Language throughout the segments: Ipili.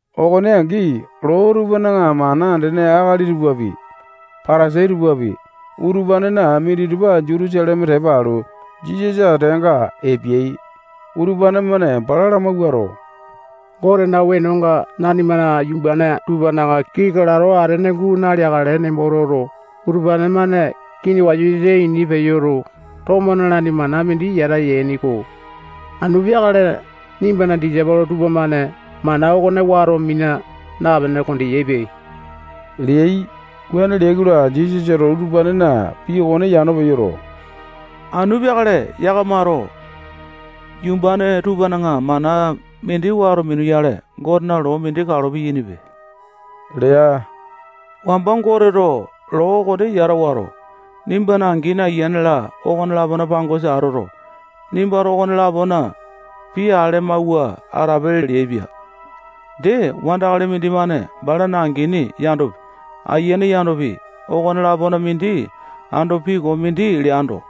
Okone angi, loo tupana mana andene akali tupapi, Patasai tupapi, utupanena minditupa Jutusaleme tepa alu, Jisasa ateanga epeai. Utupane-mane bala lamawuato, Gotena wenonga nanimana yumbane tupana kii kalato atene guu naleakale nembo toto, utupane-mane kini wasa-wasa ini peyoto, tomo nalaini mana mindi yata yaini-ko. Anu peakale nimbana disaipolo tupamane mana okone wato mina napene kondeyaipe leai. Wuane leai-kola, Jisasato utupanena pii okone yano peyoto, anu peakale yakamato yumbane tupana mana mindi wato minuyale, Gotena loo mindi kalo piyainipe lea. Wamba Goteto loo okone yata wato, nimbana angini, ayiane-la, okone-lapona pangosa atoto, nimbato okone-lapona pii ale amawua atape leaipia. Dee, wandakali mindimane balana angini yandopi, ayiane yandopi, okone-lapona mindi ando pii koo mindi leando,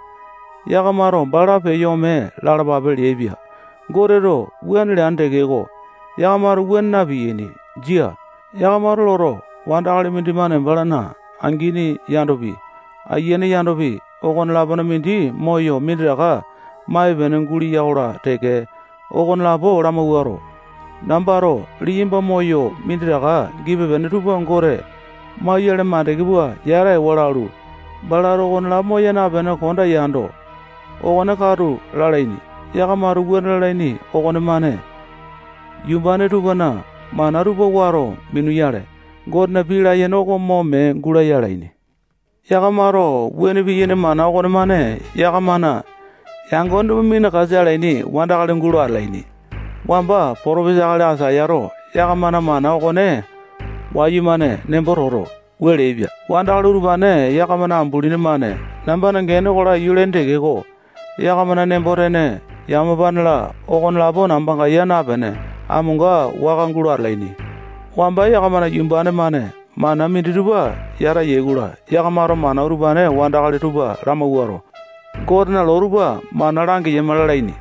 yakamato bala peyo ome lalapape leaipia. Goteto wuane leane tekeko, yakamato wuane na-piyaini. Jia. Yakamato loto, wandakali mindimane balana angini yandopi, ayiane yandopi, okone-lapona mindi moyo minditaka maipe-pene guleya-kola teke, okonelapo lamawuato, nambato liyamba moyo minditaka gipe-pene tupa Gote mauyale mandeke pua yata ewa lalu, balato okonelapo moya napene konda yando, okone katu lalaini. Yakamato wuane lalaini okonemane yumbane tupana mana tupa wato minuyale, Gotena pii layene oko mo mee gulaya alaini. Yakamato wuane piyaini mana okonemane yakamana yangone tupa minakasa alaini wandakali gulo atalaini. Wamba potopesa akali Aisayato yakamana mana okone wayumane nembo toto, wua leaipia: Wandakali utupane yakamana ambulini-mane nambana gene oko laiyu lalaini tekeko, yakamana nembo-tene, yamapane-la, okonelapo nambanga yaa napene, amonga waka gulo atalaini. Wamba yakamana yumbane-mane mana minditupa yata yai-kola, yakamato mana utupane wandakali tupa lamawuato, Gotena loo tupa mana langeyama lalaini.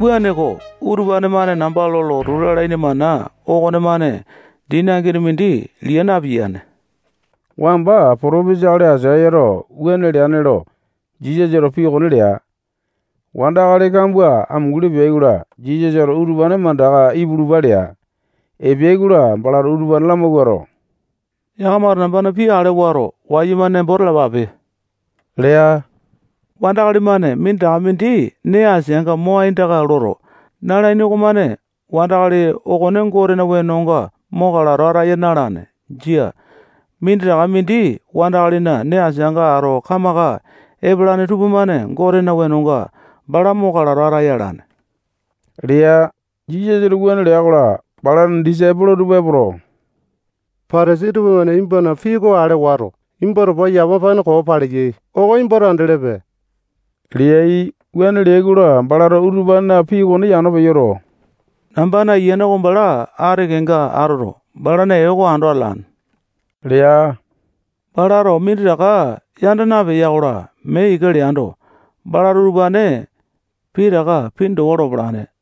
Wuaneko, utupane-mane namba lo lotu lalaini mana okonemane dini angini mindi liya napiyane. Wamba potopesa akali Aisayato wuane leane lo Jisasato pii okone lea. Wandakali kambua amunguli peai-kola, Jisasato utupane mandaka ipulupa lea. Epeai-kola, balato utupane lamawuato, yakamato nambana pii ale wato, wayumane nembo talapape lea. Wandakali-mane minditaka mindi nee asianga mo aindaka loto, nalaini okomane wandakali okone Gotena wenonga mo kalato ataya na-alane. Jia. Minditaka mindi wandakalina nee asianga ato kamaka epalane tupamane Gotena wenonga bala mo kalato ataya alane lea. Jisasato wuane lea-kola, balana disaipolo tupa epoto, Patasai tupamane nimbana pii okone ale wato, nimba towa yamapane koo paleyai oko nimbato andelepe leai. Wuane leai-kola, balato utupanena pii okone yano peyoto, nambana ayiane oko bala ati kenga atoto, balana ee oko ando atalane lea. Balato minditaka yanda napeya-kola, mee ika leando, balato utupane pitaka pini towa lopalane.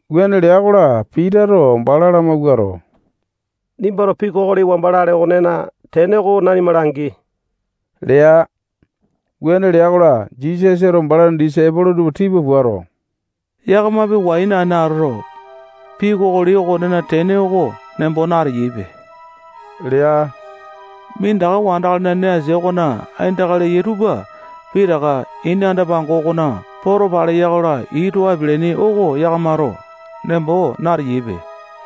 Wuane lea-kola, Pitato bala lamawuato, nimbato pii kokoli wamba lale okonena tene oko nanima langi lea. Wuane lea-kola, Jisasato balana disaipolo tupa tipa puato, yakamapi wai naene atoto, pii kokoli okonena tene oko nembo nateyaipe lea. Minditaka wandakalina nee asia okona aindaka leyai tupa pitaka ini anda-pango okona poto paleya-kola, ii too apialaini oko yakamato nembo nateyaipe.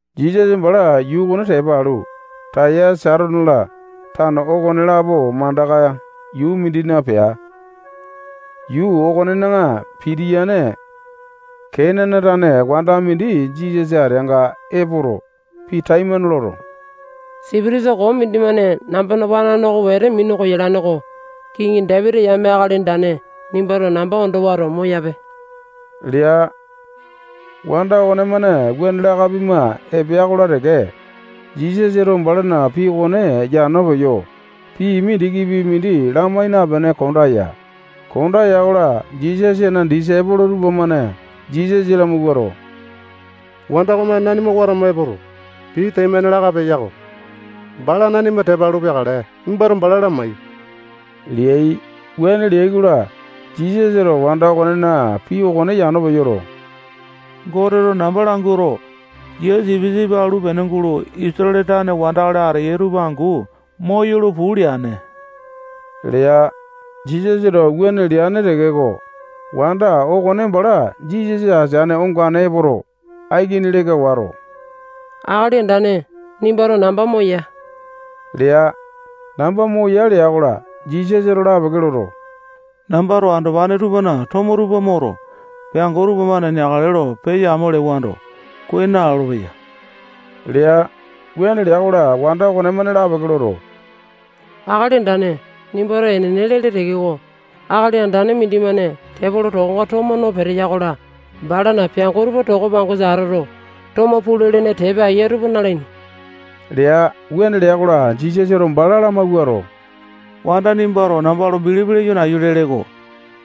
Jisasa bala yuu okone tepa alu, Taya, Saitone-la, tano okonelapo mandaka yuu mindina pea. Yuu okonena pitiyane Kenane tane wanda mindi Jisasa ateanga epoto, pii taimane loto, sipitisa koo mindimane nambana wanane oko wete minu koyalane-ko. Kiŋi Dapiti yame Akali Andane, nimbato namba ondo wato, moyape lea. Wanda okonemane wuane laka pima epea-kola teke, Jisasato balana pii okone yano peyo, pii mindikipi mindi lamai napene konda ya. Konda ya-kola, Jisasana disaipolo tupamane Jisasa lamawuato, wanda okomane nanima watama epoto, pii taimane laka peya-ko. Bala nanima tepa alu peakale. Nimbato bala lamai leai. Wuane leai-kola, Jisasato wanda okonena pii okone yano peyoto, Goteto namba languato, yia sipisipi alu pene gulo Isatale tane wandakali ateyai tupa angu moyolo puu leane lea. Jisasato wuane leane tekeko, wanda okone bala Jisasa ateane ongane epoto, aikini leka wato, Akali Andane, nimbato namba moya lea. Namba moya lea-kola, Jisasato lapeke loto, nambato andopane tupana tomo tupa moto, peango tupamane neakale lo peya-amo lewando, kuai nalolo-peya lea. Wuane lea-kola, wanda okonemane lapeke loto, Akali Andane, nimbato enene lele tekeko, akali andane mindimane tepolo tokonga tomo no peteya-kola, balana peango tupa toko pangosa atoto, tomo pulu-lene tepa eya tupa nalaini lea. Wuane lea-kola, Jisasato bala lamawuato, wanda nimbato namba lo bilipi leyo nayu lele-ko.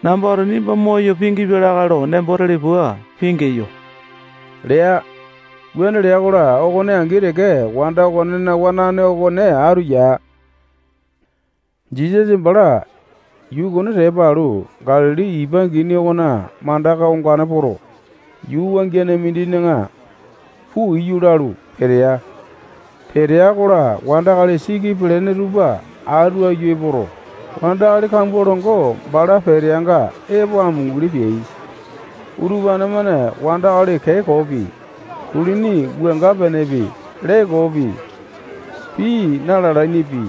Nambato nimba moyo pingipia lakae lo nembo tele pua pingeyo lea. Wuane lea-kola, okone angi teke wanda okonena wanane okone atu ya. Jisasa bala yuu okone tepa alu, Galili ipa angini okona mandaka ongane poto, yuu wangiane mindina puu iyu lalu, petea. Petea-kola, wandakali siki pelene tupa atu aiyu epoto, wandakali kambua longo bala peteanga epo amunguli peai. Utupane-mane wandakali kee koopi, kulini wuanga-penepi, lee koopi, pii na-lalainipi,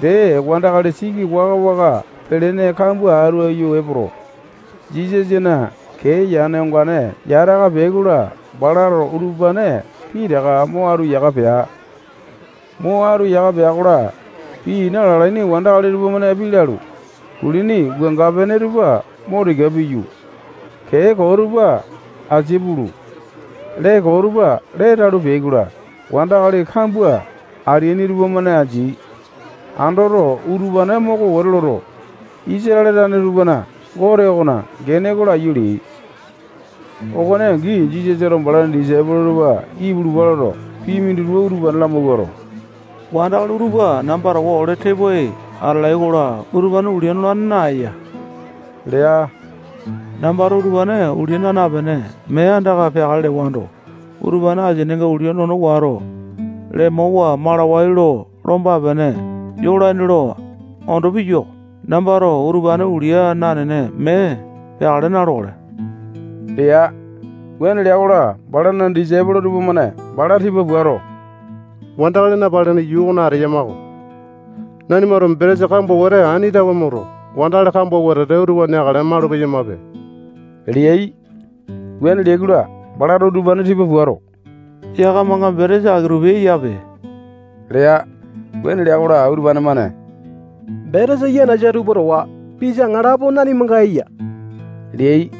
dee wandakali siki waka-waka pelene kambua atu aiyu epoto, Jisasana kee yane ongane yata aka peai-kola, balato utupane pitaka mo atu yaka pea. Mo atu yaka pea-kola, pii na-lalaini wandakali tupamane pii lalu, kulini wuanga-pene tupa mo tika piyu, kee koo tupa asia pulu, lee koo tupa lee talu, peai-kola, wandakali kambua ateaini tupamane andeai. Andoto, utupane moko wete loto, Isatale tane tupana Gote okona gene oko laiyu leai. Okone angi Jisasato balana disaipolo tupa ipulupa loto, pii mindi utupane lamawuato, wandakali utupa namba towa ole tepoai atalai-kola, utupane ulia nolane naeya lea. Nambato utupane ulia naa napene, mee andaka peakale lewando, utupane asininga ulia nono wato, lemowa malawai lo lomba-pene yolaini lo ondo piyua-ko. Nambato utupane ulia nanene mee peakale na-lokale lea. Wuane lea-kola, balana disaipolo tupamane bala tipa puato, wandakali napalene yuu okona ateyama-ko. Nanimato betesa kambua wete ani tawe moto, wandakali kambua wetete utupa neakale malu-peyamape leai. Wuane leai-kola, balato utupane tipa puato, yakamanga betesa aki-tupi eyape lea. Wuane lea-kola, utupane-mane betesa yanasa tupa towa pisa aŋalapo nanimanga eya leai.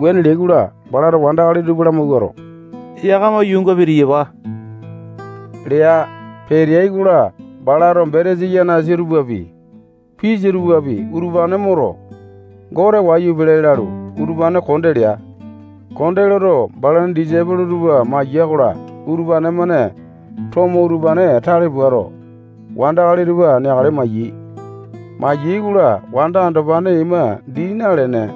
Wuane leai-kola, balato wandakali tupa lamawuato, yakama yuunga pitiyapa lea. Peteai-kola, balato betesa yanasa tupapi, pisa tupapi, utupane moto, Gote wayu lalu, utupane konde lea. Konde loto, balana disaipolo tupa maya-kola, utupane-mane tomo utupane tale puato, wandakali tupa neakale mayai. Mayai-kola, wanda andopane ima dii nalene,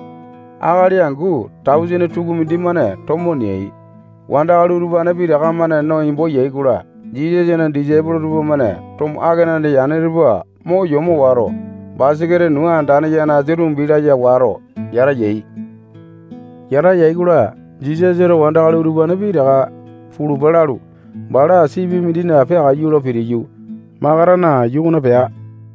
akali angu tausene tukumindi-mane tomo neai. Wandakali utupane pitaka-mane no embo yai-kola, Jisasana disaipolo tupamane tomo akenane yane tupa mo yomo wato, basaketa nuu andane yanasa tumbi laya wato yata yai. Yata yai-kola, Jisasato wandakali utupane pitaka pulupa lalu, bala sipi mindina peakaiyu lo pitiyu, Makatana yuu okona pea.